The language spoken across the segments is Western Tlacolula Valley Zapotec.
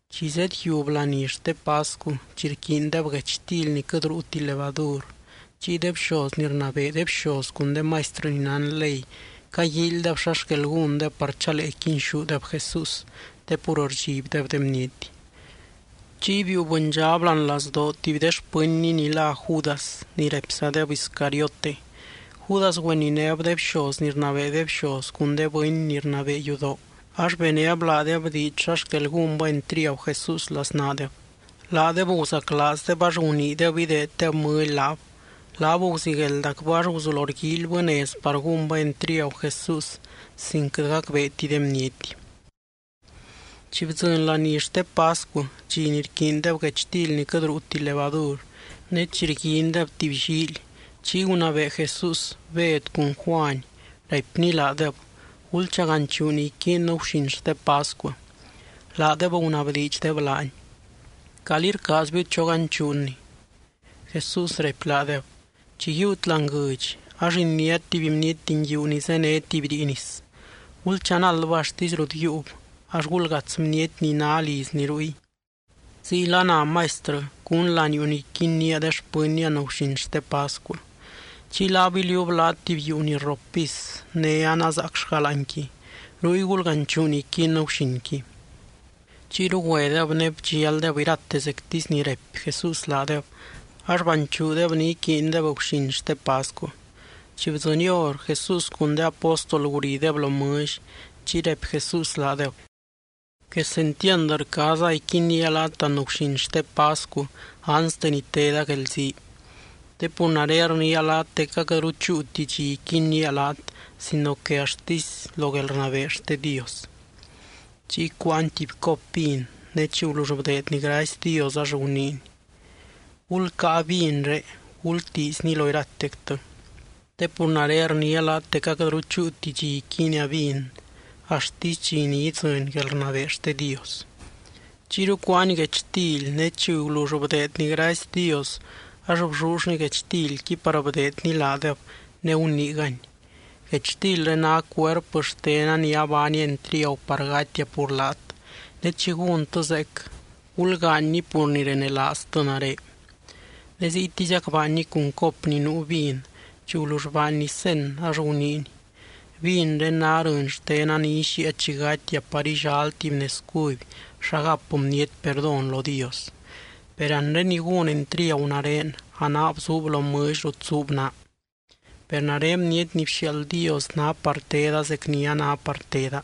Chi zedyiub laní xte pascu, chi rquiindeb guechtily ni quɨt ruuti levadur, chiy de bxoz ni rnabee de bxoz cun de maistrɨ ni nán ley caguíilydeb xa xquel gúndeb par chalee quinxúdeb Jesús, te pur rdxibdeb de bniety. Chiy biiu bɨndxab láani lazdoo tuby de xpɨnny ni lá Judas ni raipzadeb Iscariote. Judas güeninéb de bxoz ni rnabee de bxoz cun de bɨny ni rnabee yudoo, ax benéb laadeb diidx xa xquel gúnbɨ entriagu Jesús laznaadeb. Laadeb guzaclaazdeb ax guniideb ideeddeb mɨly laab. Laab guzigueldacbɨ ax guzulo rguíilybɨ nez par gúnbɨ entriagu Jesús sin quɨt gacbeeti de bniety. Chi bdzɨny laní xte pascu dxi ni rquiindeb guechtily ni quɨt ruuti levadur, ne chi rguindeb tuby llíily, chiy gunabee Jesús Bed cun Juany, raipny laadeb: —Gulchaganchuu ni iquiinnɨ guxin xte pascu. Laadeb gunabdiidxdeb laany: —¿Calí rcaazbiu choganchuuni? Jesús raipy laadeb: —Chi yiiut láani guɨdx, ax iniát tuby bniety nguiu ni zéne tuby rii nis. Gulchanaldbɨ axtisy rut yiiub, ax gulgats bniety ni ná lizni ruy: “Ziyla ná Maistrɨ: ¿Cún laniuu ni iquinnía de xpɨnnia anguxin xte pascu?” Chiy laab iliuub laat tuby yuu ni rrop pis, ne anazaacllga láanqui. Ruy gulganchuu ni iquiinnɨ guxinqui. Chiyru güedeb ne bdxialdeb irate zectisy ni raipy Jesús laadeb. Ax banchuudeb ni iquiindeb guxin xte pascu. Chi bdzɨny hor, Jesús cun de apóstol gurideb lo mɨlly. Chiy raipy Jesús laadeb: —¡Quesentiand rcaaza iquinnía laat anguxin xte pascu anste ni teda guelzii! Te pur nare rniia laat dec aquɨtru chúuti dxi iquinnía laat sino que axtisy lo guelrnabee xte Dios. Chiy cuáany tuby cop vin, ne chi gulull bdeedny gracy Dios, ax guniiny: —Gulcáa vinré, gultiizni lo iratectɨ. Te pur nare rniia laat dec aquɨtru chúuti dxi iquiinia vin, axtisy dxi ni idzɨny guelrnabee xte Dios. Chiyru cuáany guechtily, ne chi gulull bdeedny gracy Dios, ax bllullny guechtilqui, par bdeedny laadeb ne guniigany: —Guechtilré ná cuerpɨ xtena ni abaania entriagu par gatia pur laat. Ne chi gúntɨ zeec, gulgaanyni pur ni renelaaztɨ nare. Ne ziytiziac baanny cun cop ni nuu vin chi gulull baanny cen, ax guniiny: —Vinré ná rɨny xtena ni ixíia chi gatia par illal tuby nez cuby xa gap bniety perdón lo Dios. ’Per anre ni gún entriagu nare a naab zuub lo mɨlly rut zuub naa. Per nare Bniety ni bxiaald Dios ná par teda zec ni a ná par teda.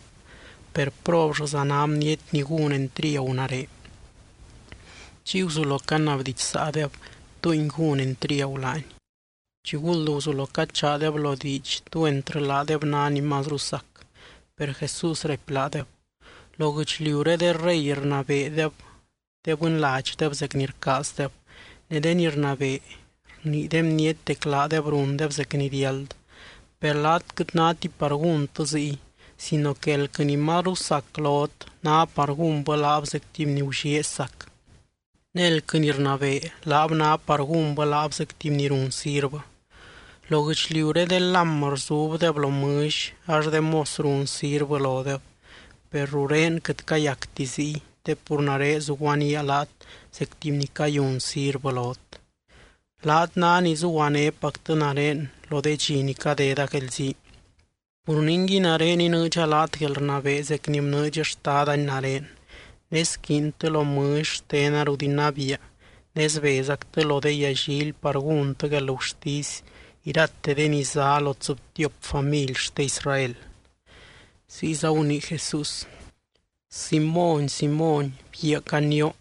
Per, ¡probllɨza ná bniety ni gún entriagu nare! Chiy guzulo canabdidxsaadeb, túngui gún entriagu laany. Chiguld guzulo cachaadeb lo diidx tú entrɨ laadeb ná ni mazru sac. Per Jesús raipy laadeb: —Lo guɨchliuré de rey rnabeedeb de bɨnladxdeb zec ni rcaazdeb, ne de ni rnabee, rnii de bniety dec laadeb rundeb zec ni riáld. Per laat quɨt náti par gúntɨ ziy sino que elquɨ ni mazru sac lot, ná par gúnbɨ laab zec tuby ni gullieezy sac. Ne elquɨ ni rnabee, laab ná par gúnbɨ laab zec tuby ni run sirvɨ. Lo guɨchliuré de lám rzubdeb lo mɨlly, ax de mos run sirvɨ lodeb. Per rurén quɨt cayacti ziy te pur nare zuguaníaa laat zec tuby ni cayun sirvɨ lot. ’Laat ná ni zuguanépactɨ nare lo de dxi ni cadeda guelzii. Pur ningui, nare inɨɨdxa laat guelrnabee zec ni bnɨɨdx Xtadani nare, ne squiintɨ lo mɨlly xtena rut inabiia ne sbezactɨ lo de yallily par gúntɨ guelgurtisy irate de ni zá lo tsɨbtiop family xte Israel. Ziyza gunii Jesús: —Simóny, Simóny, bguiaa canioo,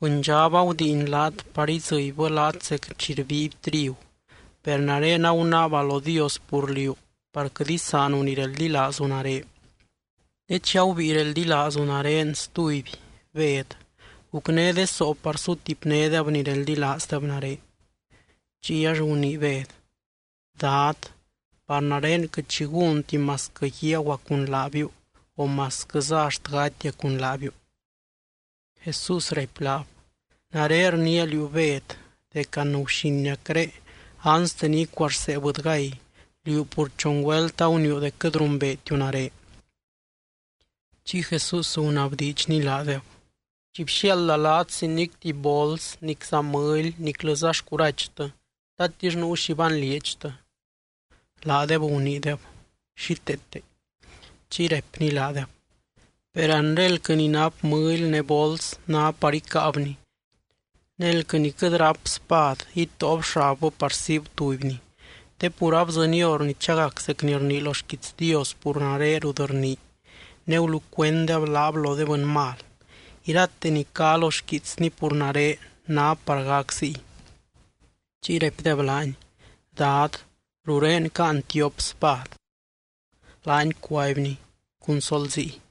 bɨndxab agudiin laat, par idzɨbybɨ laat zec chi rbiiby trigu. Per nare agunaaba lo Dios pur liú par quɨt isaanu ni reldilaazu nare. Ne chi agubíi reldilaazu nare stuby, Bed, gucné de soo par sutipnédeb ni reldilaazdeb nare. Chiy ax gunii Bed: —Dad, par nare quɨt xi gúnti masquɨ guiaguaa cun laabiu o masquɨza axt gatia cun laabiu. Jesús raipy laab: —Nare rniia liú, Bed, dec anguxiniacré, anste ni icuarsee bɨdygay, liú pur chon güelt aguniiu dec quɨt rumbeetiu nare. Chiy Jesús gunabdiidxny laadeb: —Chi bxiaalda laat sin nic tuby bols, nicza mɨly niclɨza xcurachtɨ, ¿tatix nuu xi banlieedxtɨ? Laadeb guniideb: —Xíteete. Chiy raipny laadeb: —Per anre elquɨ ni nap mɨly ne bols ná par icáabni. Ne elquɨ ni quɨt ráp spad, itóob xabbɨ par siib tubyni. Te pur abdzɨny hor ni chagac zec ni rnii lo xquiits Dios pur nare rut rnii: “Ne gulucuenddeb laab lo de bɨny mal.” Irate ni cá lo xquiitsny pur nare ná par gac ziy. Chiy raipdeb laany: —Dad, rurén caan tiop spad. Laany cuaibny: —Cun sol ziy.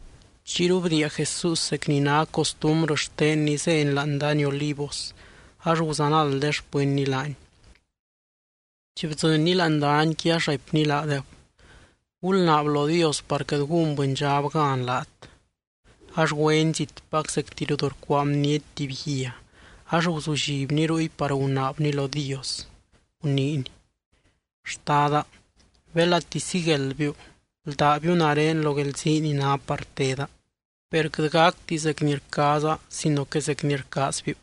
Chiyru bdiia Jesús, zec ni ná costumbrɨ xtenny zény láani dany Olivos ax guzanald de xpɨnny laany. Chi bdzɨnny láani danyqui ax raipny laadeb: —Gulnaab lo Dios, par quɨt gún bɨndxab gan laat. Ax güeny zitpac zecti rut rcuaa bniety tuby guia, ax guzullibny ruy par gunaabny lo Dios guniiny: —Xtada, belati sigueldbiu, bldábiu nare lo guelzii ni ná par teda. Per quɨt gacti zec ni rcaaza, sino que zec ni rcaazbiu.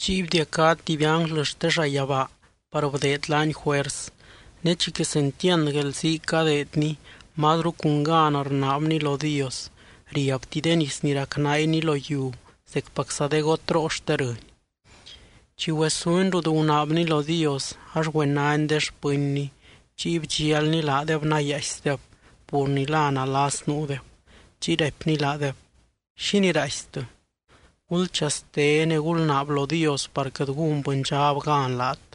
Chiy bdiacá tuby ánglɨ xte llayabaa par bdeed laany juers. Ne chi quesentiand guelzii cadeedny mazru cun gan rnaabny lo Dios, riabti de nis ni racnaainy lo yiu zecpacza de gotroo xte rɨny. Chi güesuny rut gunaabny lo Dios, ax güenany de xpɨnny chiy bdxialny laadeb nayaaisdeb, pur ni la nalas nuudeb. Chiy raipny laadeb: —¿Xínii raaistɨ? Gulchaste, ne gulnaab lo Dios par quɨt gún bɨndxab gan laat.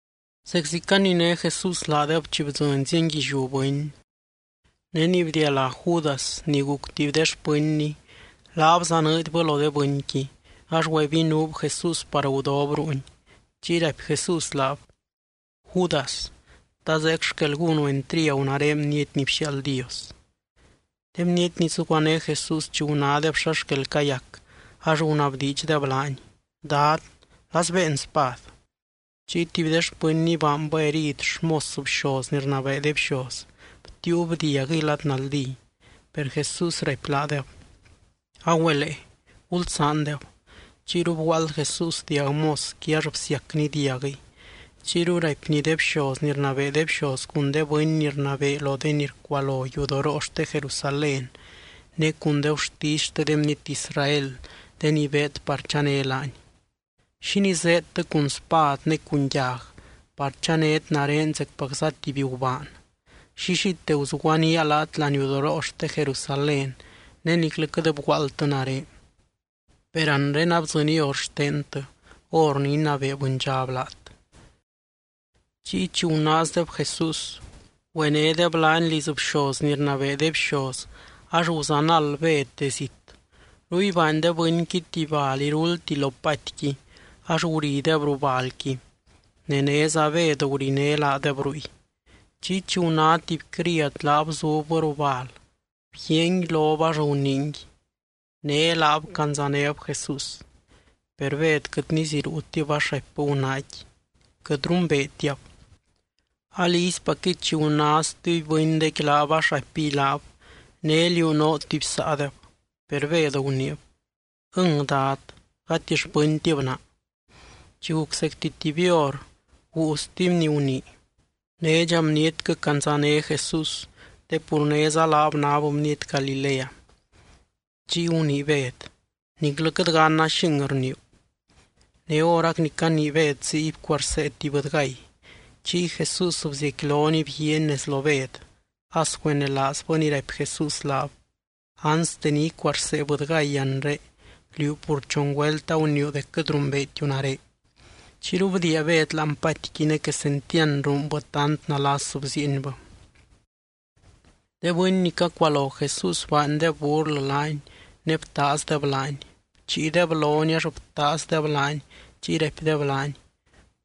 Zeczi caniné Jesús laadeb chi bdzɨny zienguilliú bɨny. Ne ni bdialá Judas, ni guc tuby de xpɨnny, laab zanɨɨdybɨ lo de bɨnqui, ax güebinuub Jesús par gudob ruuny. Chiy raipy Jesús laab: —Judas, ¿ta zeec xquel gúnu entriagu nare Bniety ni bxiaald Dios? De bniety ni zuguané Jesús, chi gunádeb xa xquel cayac ax gunabdiidxdeb laany: —Dad, ¿la sbéen spad? Chiy tuby de xpɨnny baanbɨ herid xmos bxoz ni rnabee de bxoz, btiiub diaguɨy lad naldí. Per Jesús raipy laadeb: —Agüelee. Gulsaandeb. Chiyru bguaald Jesús diag mosqui ax bsiacny diaguɨy. Chiyru raipny de bxoz ni rnabee de bxoz cun de bɨny ni rnabee lo de ni rcualo yudoroo xte Jerusalén ne cun de gurtisy xte de bniety Israel, de ni beed par chané laany: —¿Xínii zéedtɨ cun spad ne cun yag, par chanét nare zecpacza tuby gubaan? Llillite guzuguanía laat laniudoroo xte Jerusalén ne niclɨ quɨt bguaaldtɨ nare. Per anre abdzɨny hor xtentɨ, hor ni inabee bɨndxab laat. Chiy chi gunaazdeb Jesús, güenédeb laany liz bxoz ni rnabee de bxoz ax guzanald Bed de zit. Ruy baany de bɨnqui tuby bal iruldti lo patiqui, ax gurideb ruu balqui. Ne néza Bed guriné laadeb ruy. Chiy chi guná tuby criad laab zubbɨ ruu bal, bguiaangui lob ax guniingui: —Né laab candzanéb Jesús. Per Bed quɨt niziruutib ax raipbɨ gunaaqui: —Quɨt rumbeetiab. Alizypacquɨy, chi guná stuby bɨndequi laab ax raipiy laab: —Né liú noo tuby saadeb. Per Bed guniib: —Ɨng, Dad, gati xpɨntib naa. Chi guc zecti tuby hor, guu stuby ni gunii: —Nédxa bnietquɨ candzané Jesús, te pur néza laab náb bniety Galilea. Chiy gunii Bed: —Niclɨ quɨt ganna xing rniiu. Ne horac ni canii Bed ziy, bcuarsee tuby bɨdygay. Chiy Jesús bziecquilony bguiaany nez lo Bed, as güenelaazbɨ ni raipy Jesús laab: “Anste ni icuarsee bɨdygay anre, liú pur chon güelt aguniiu dec quɨt rumbeetiu nare.” Chiyru bdiia Bed láani patiqui ne quesentiand ruunbɨ tant nalas bziienbɨ. De bɨny ni cacualo Jesús baandeb burlɨ laany ne btaazdeb laany. Bchiideb lony ax btaazdeb laany chiy raipdeb laany: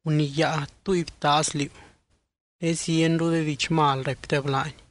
—¡Guniyáa, túy btaaz liú! Ne zienru de diidx mal raipdeb laany.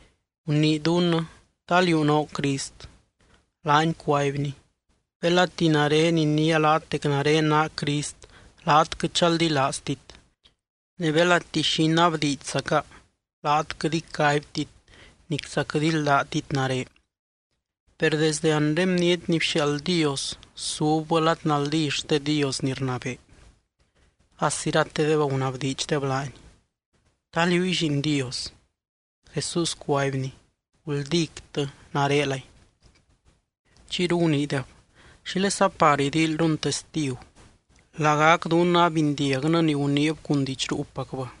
—Gunii dunnɨ, ¿ta liú noo Crist? Laany cuaibny: —Belati nare iniia laat dec nare naa Crist laat quɨt chaldilaaztit. Ne belati xi inabdiidxzaca, laat quɨt icaibtit, nicza quɨt íldatit nare. Per desdɨ anre Bniety ni bxiaald Dios subbɨ lad naldí xte Dios ni rnabee. As iratedeb gunabdiidxdeb laany: —¿Ta liúy Lliin Dios? Jesús cuaibny: —Guldíctɨ, narelay. Chiyru guniideb: —¿Xílesa par idíilyrun testigu? Lagac dunnɨ abindiagnɨ ni guniib cun diidx ruupacbɨ.